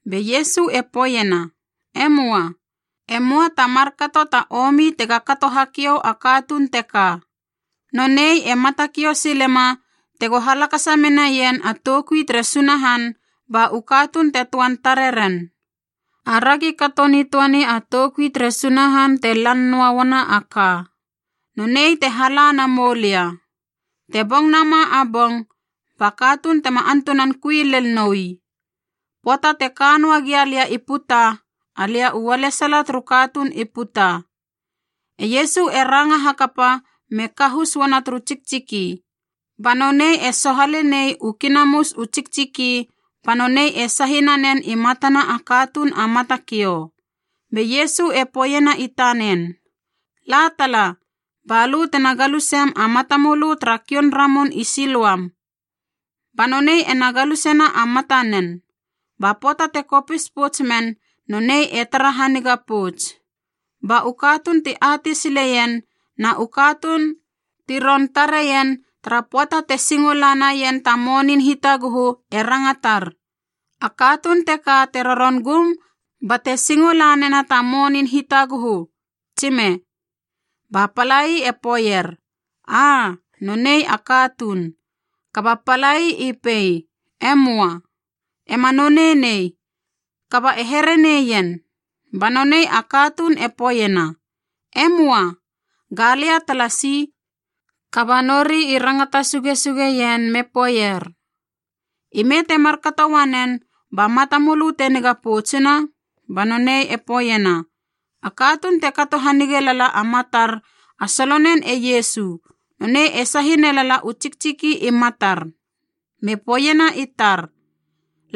Be Iesu e poeiena, “E möa. E möa ta markato ta omi tega kato hakiou a katuun teka. Nonei e matakiou silema tego halakasa menaien a toukui tere Sunahan ba u katuun te töan tareren. Aragi kato nitöani a toukui tere Sunahan te lan noa uana a ka, nonei te hala na moulia. Te bong nama a bong, ba katuun tema antunan kui lel noi. Pöata te ka noa gia lia i puta, alia u ualesala turu katuun i puta.” E Iesu e ranga hakapa me kahus uana turu tsiktsiki, ba nonei e sohale nei u kinahus u tsiktsiki ba nonei e sahi nanen i matana a katuun a matakiou. Be Iesu e poeiena i tanen, “La tala, ba lö tena galusem a matamölö tara kioun ramun i Siloam.a” Ba nonei ena galusena a matanen, ba pöata te kopis pouts men nonei e tara haniga pouts. Ba u katuun ti atei sileien na u katuun ti ron tareien tara pöata te singo la naien ta monin hitaguhu e rangatar, “A katuun teka te roron gum bate singo lanena ta monin hitaguhu, tsime?” Ba palai e poeier, “Aa, nonei a katuun.” Kaba palai i pei, “E möa. Ema nonei nei, kaba e here neien.” Ba nonei a katuun e poeiena, “E möa, galia talasi.” Kaba nori i rangata sugesugeien me poeier, “Ime te markato uanen ba matamölö te niga poutsuna?” Ba nonei e poeiena, “A katuun te kato hanige lala a matar a solonen e Iesu nonei e sahi nelala u tsiktsiki i matar me poeiena i tar,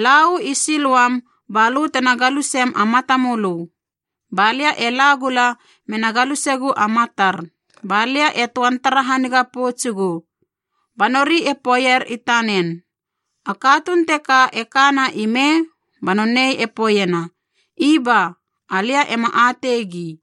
‘La uu i Siloam balö tena galusem a matamölö.’ Ba lia e la gula mena galusegu a matar, balia e töan tara haniga poutsugu.” Ba nori e poeier i tanen, “A katuun teka e kana ime?” Ba nonei e poeiena, “Iba, alia ema ateigi.”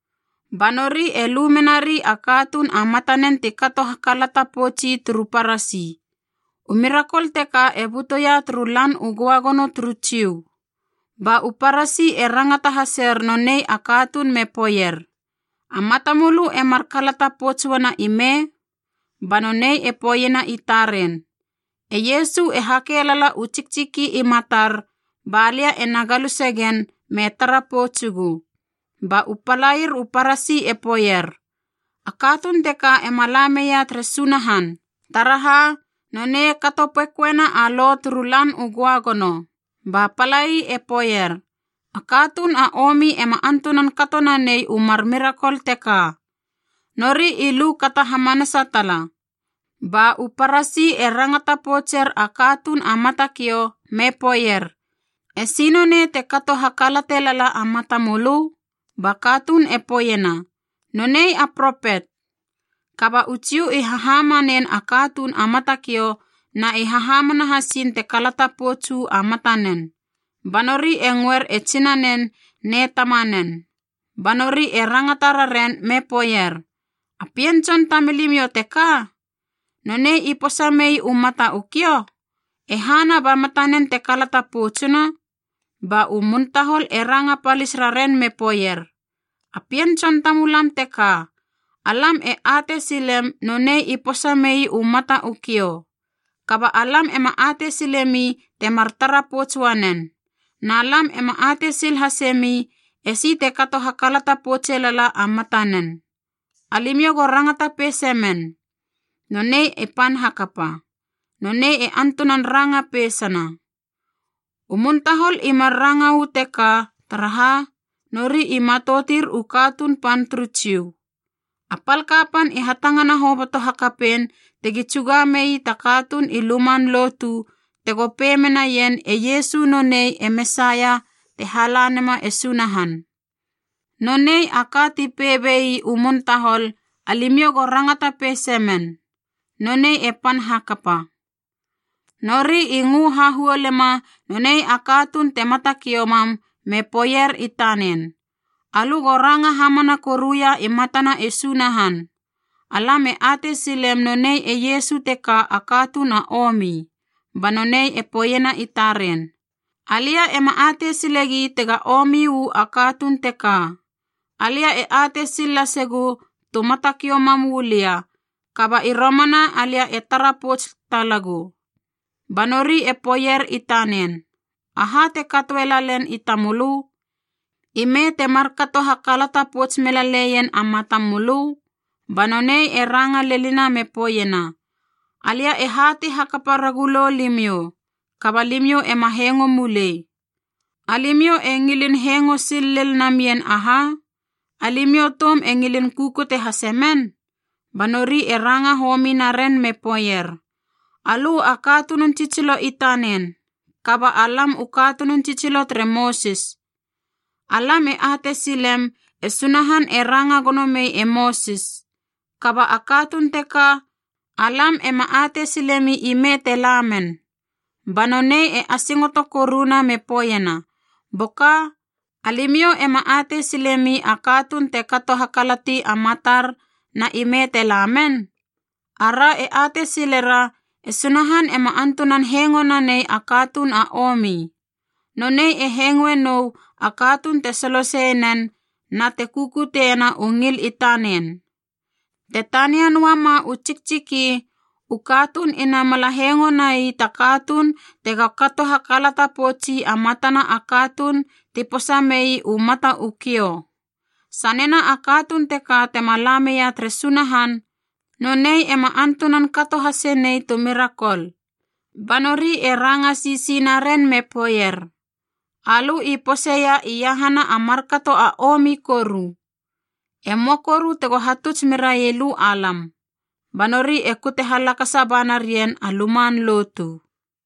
Ba nori e lu menari a katuun a matanen ti kato hakalata poutsi turu Parasi. U mirakol teka e butuia turu Lan u Göagono turu Jiu. Ba u Parasi e rangata haser nonei a katuun me poeier, “A matamölö e mar kalata pouts uana ime?” Ba nonei e poeiena i taren, “E Iesu e hake lala u tsiktsiki i matar balia ena galuse gen me tara poutsugu.” Ba u palair u Parasi e poeier, “A katuun teka ema la meia tere Sunahan, taraha nonei kato pekoena a lo turu Lan u Göagono.” Ba palai e poeier, “A katuun a omi ema antunan kato nanei u mar mirakol teka.” Nori i lu kata hamanasa tala. Ba u Parasi e rangata poutser a katuun a matakiou me poeier, “E si nonei te kato hakalate lala a matamölö?” Ba katuun e poeiena, “Nonei a propet!” Kaba u Jiu i hahamanen a katuun a matakiou na i hahamana hasiin te kalata pouts uu a matanen. Ba nori e ngöer e tsinanen ne tamanen. Ba nori e rangata raren me poeier, “A pien tson tamilimiou teka? Nonei i posa mei u mata u kiou? E hana ba matanen te kalata poutsuna?” Ba u muntahol e ranga palis raren me poeier, “A pien tson tamulam teka, alam e atei silem nonei i posa mei u mata u kiou. Kaba alam ema atei silemi temar tara pouts uanen, na lam ema atei sil hasemi esi te kato hakalata poutse lala a matanen. Alimiou go rangata peise men. Nonei e pan hakapa. Nonei e antunan ranga peisana.” U muntahol i mar ranga uu teka taraha nori i matoutir u katuun pan turu Jiu. A pal kapan i hatangana hoboto hakapein tegi tsuga mei ta katuun i luman lotu tego pei menaien e Iesu nonei e Mesaia te hala nema e Sunahan. Nonei a ka ti pei bei u muntahol, “Alimiou go rangata peise men. Nonei e pan hakapa.” Nori i ngö hahuolema nonei a katuun te matakiou mam me poeier i tanen, “Alö go ranga hamana koruia i matana e Sunahan. Alam e atei silem nonei e Iesu teka a katuun a omi.” Ba nonei e poeiena i taren, “Alia ema atei silegi tega omi uu a katuun teka. Alia e atei sil lasegu tu matakiou mam uu lia, kaba i romana alia e tara pouts talagu.” Ba nori e poeier i tanen, “Aha te katoe lalen i tamölö? Ime te markato uelalen na ime te markato hakalata pouts melaleien a matamölö?” Ba nonei e ranga lenina me poeiena, “Alia e hatei hakapa ragulou limiou, kaba limiou ema hengo mulei. Alimiou e ngilin hengo sil lel namien aha? Alimiou toum e ngilin kukute hase men?” Ba nori e ranga homi naren me poeier, “Alö a katunun tsitsilo i tanen, kaba alam u katunun tsitsilo tere Mosis. Alam e atei silem e Sunahan e ranga gono mei e Mosis. Kaba a katuun teka, alam ema atei silemi ime te la men.” Ba nonei e asingoto koruna me poeiena, “Boka! Alimiou ema atei silemi a katuun te kato hakalati a matar na ime te la men? Ara e atei silera e Sunahan ema antunan hengo nanei a katuun a omi. Nonei e hengoe nou a katuun te soloseie nen na te kukuteiena u ngil i tanen. Te tania noua ma u tsiktsiki u katuun ina mala hengo nai ta katuun tega kato hakalata poutsi a matana a katuun ti posa mei u mata u kiou. Sanena a katuun teka tema la meia tere Sunahan, nonei ema antunan kato hasenei tu mirakol.” Ba nori e ranga sisi naren me poeier, “Alö i poseia iahana a markato a omi koru! E möa koru tego hatuts merai lö alam!” Ba nori e kute halakasa ba narien a luman lotu.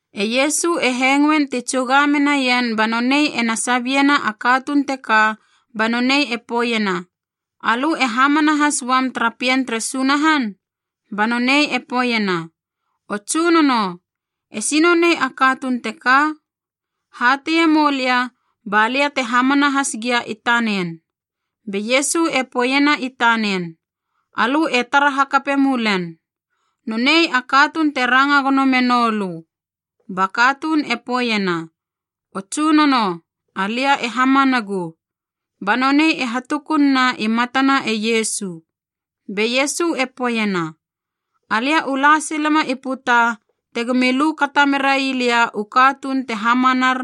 E Iesu e hengoein ti tsuga menaien ba nonei ena sabiena a katuun teka ba nonei e poeiena, “Alö e hamana has uam tara Pien tere Sunahan?” Ba nonei e poeiena, “O Tsunono, esi nonei a katuun teka? Hateie moulia balia te hamana has gia i tanen.” Be Iesu e poeiena i tanen, “Alö e tara hakape mulen. Nonei a katuun te ranga gono me noulö.” Ba katuun e poeiena, “O Tsunono, alia e hamanagu.” Ba nonei e hatukun na i matana e Iesu. Be Iesu e poeiena, “Alia u la silema i puta tegomi lu kata merai lia u katuun te hamanar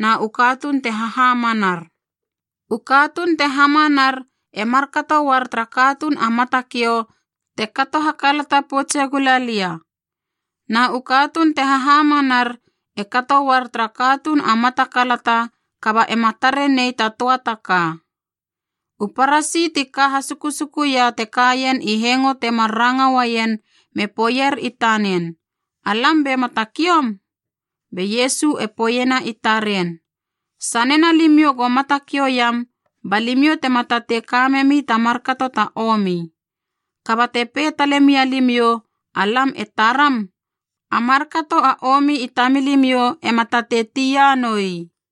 na u katuun te hahamanar. U katuun te hamanar e markato uar tara katuun a matakiou te kato hakalata poutse gula lia. Na u katuun te hahamanar e kato uar tara katuun a mata kalata kaba ema tare nei ta töa taka.” U Parasi ti ka hasukusukuia te kaien i hengo temar ranga uaien me poeier i tanen, “Alam be matakioum?” Be Iesu e poeiena i taren, “Sanena limiou go matakiou iam ba limiou tema tatei kamemi ta markato ta omi. Kaba te pei tale mialimiou, ‘alam e taram,’ a markato a omi i tamilimiou ema tatei tia noi.”